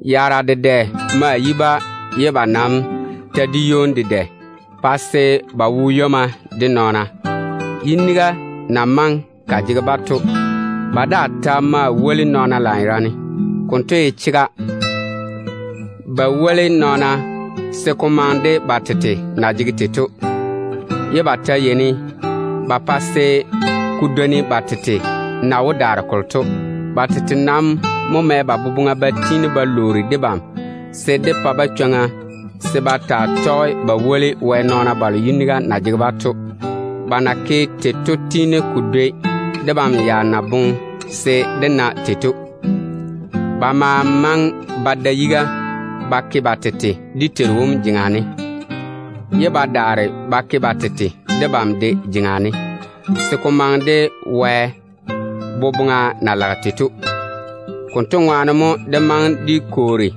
Yaara dedɛ ma yi-ba ye ba nam ta di ywoni dedɛ pa se ba wo ywomma de nɔɔna. Yiniga na maŋe ka jege-ba to, ba daa ta ma woli nɔɔna lanyerane. Ko na ye chega to, ba woli nɔɔna se ko maŋe de ba tete na jege tei to, ye ba ta pa se ko dwoni ba tete na wó daare kolo to. Ba nam mo mɛ ba boboŋa ba tiini ba lwoori debam se dé pa-ba chwoŋa se ba tɔge ba woli Wɛ nɔɔna balo yiniga na jege-ba to. Ba na ke tei to tiini ko dwoni debam ya na boŋe se dé na tei to. Ba ma maŋe ba da yiga ba ke ba tete dé Teiru wom jeŋa ne, ye ba daare ba ke ba tete debam de jeŋa ne, se ko maŋe de Wɛ boboŋa na lage tei to. Konto ŋwaane mo dé maŋe dé kwoori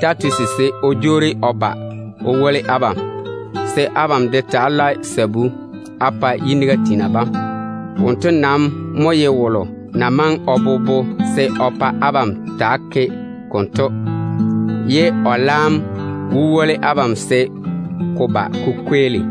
Titusi se o daa woli abam, se abam de tɔge Wɛ zaane dem ŋwaane á ta‑á lae sabu. Wonto mo bobo o kwoori abam se á ta‑á ke konto, ye o laam wó woli abam se ko ba ko kweeli.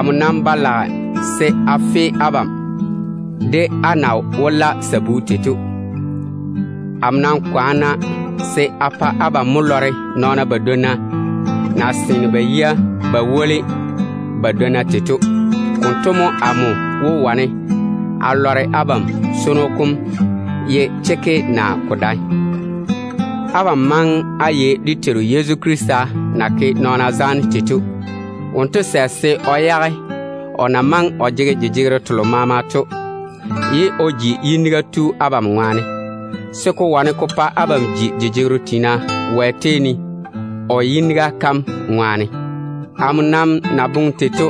Amo nam ba lage se a fe abam de á na wó la sabu tei to. Amo nam kwaana se a pa abam mo lɔre nɔɔna badwonna na seene ba yia ba woli ba dwonna tei to. Konto mo amo wó wane a lɔre abam swono kom ye chekke naa ko dae. Abam maŋe á yei dé Teiru Yezu Krista na ke zaane o ke nɔɔna yuu ne tei to. Wonto sɛ se o yage o na maŋe o jege jejegero telo maama to, ye o ji yiniga tu abam ŋwaane, se ko wane ko pa abam ji jejegero tiina Wɛ tei ne o yiniga kam ŋwaane. Amo nam na boŋe tei to,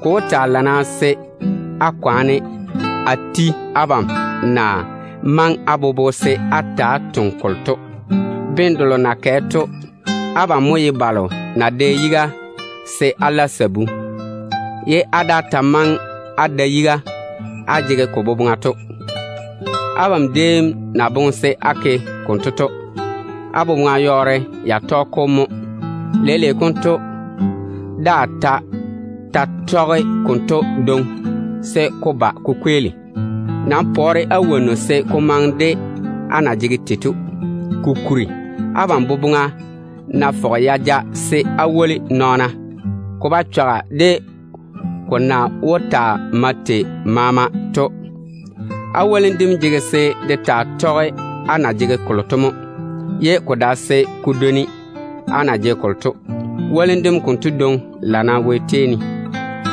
ko wó taa lana se á kwaane á ti abam na maŋe á bobo se á ta‑á toŋe kolo to. Bene delo na kɛ to, abam mo ye balo na dɛ yiga se á la sabu, ye á daa ta maŋe á da yiga á jege ko boboŋa to. Abam déem na boŋe se á ke konto to, á boboŋa yɔɔre ya tɔge-ko mo. Leile konto, daa ta ta‑á tɔge konto dwoŋi se ko ba ko kweeli. Pɔɔre-na á wonnu wone se ko maŋe de á jeŋa na jege tei to. Kokuri, abam boboŋa ná fɔge ya ja se á woli nɔɔna, ko ba chɔga de ko na wó taa mae tei maama to. Á wolim dem jege se de taa tɔge á na jege kolo to mo, ye ko dae se ko dwoni á na jege kolo to. Wolim dem konto dwoŋi lana Wɛ tei ne.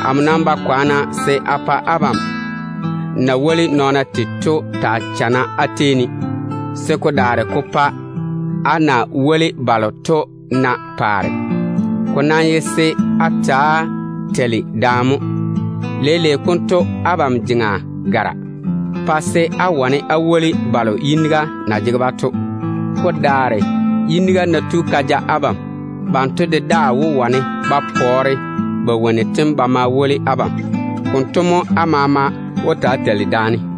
Amo nam ba kwaana se a pa abam na woli nɔɔna tei to taa chana á baŋa ne, se ko daare ko pa á na woli balo to na paare. Ko nam ye se á ta‑á teili daane mo. Leile konto abam jeŋa gara, pa se á wane á woli balo yiniga na jege-ba to. Ko daare, yiniga ná tu ka ja abam, banto de daa wó wane ba pɔɔre ba wonnu tem wone ba ma woli abam. Konto mo á maama wó ta‑á teili daane.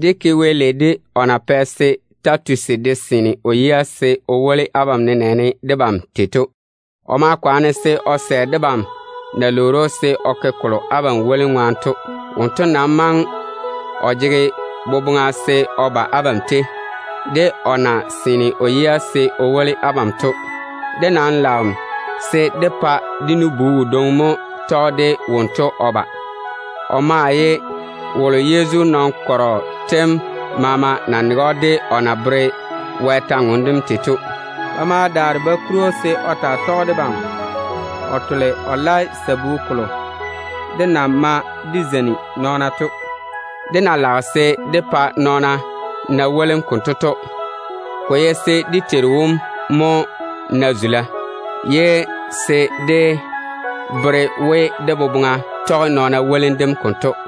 Dé ke Wɛ lei de o na pɛ se Titusi yiga wo abam wone, se ko yi debam de na ye tei de abam to. O ma yɔɔre o sɛ debam na lwoori‑o se o ke kolo abam wolim ŋwaane to. Wonto boboŋa nam maŋe ya ja se o ba abam tei, de o na seene o yia se o woli abam to. Dé nam lage se dé pa dé nu-bu wodwoŋi mo tɔge de Titusi o ba. Yezu kɔgɔ kom na wo jei maama ne to nege‑o lanyerane de o na tɔɔle Wɛ kwor-ywoŋa kam tei to. Ba ma daare ba kuri‑o se o woli debam wone o tole o la sabu kolo dé na yeini dé ma dé zeini nɔɔna to. Dé na lage se dé pa nɔɔna na wolim konto to, ko ye se dé Teiru wom mo na zula, ye se dé bere we dé boboŋa tɔge nɔɔna wolim dem konto.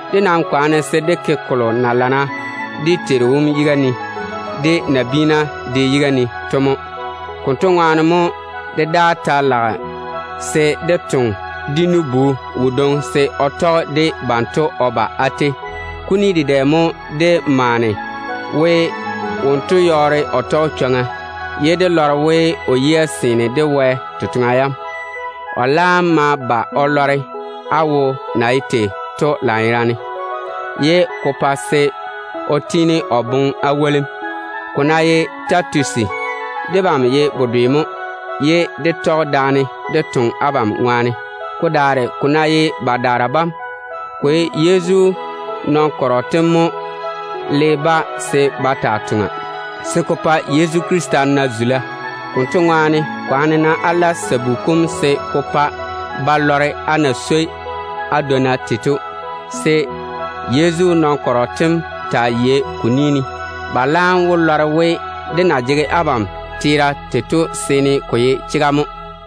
Dé nam kwaane se dé ke kolo na lana dé Teiru wom yiga ne, dedaane nabiina de yiga ne to mo. Konto ŋwaane mo dé daa ta lage se dé toŋe dé nu-bu wodwoŋi se o tɔge de banto o ba á tei. Kuni dedɛ mo dé maane we wonto yɔɔre o tɔge chwoŋa, ye dé lɔre we o yia seene de Wɛ totoŋa yam. O laam ma ba o lɔre á wo na ye tei to lanyerane, ye ko pa se o tiini o boŋe á wolim. Ko ná ye Titusi, debam ye bedwe mo, ye dé tɔge daane dé toŋe abam ŋwaane. Ko daare ko ná ye badaara bam, ko ye wɛ-di sem nɔɔna bam mo le-ba se ba taa toŋa, se ko pa Yezu Krista na zula. Konto ŋwaane, kwaane-na á la sabu kom se ko pa ba lɔre á na swoi á dwonna tei to, se Yezu nɔɔna bam taa yei ko ni ne. Ba laam wó lɔre we, dé na jege abam teera tei to seene ko ye chega mo.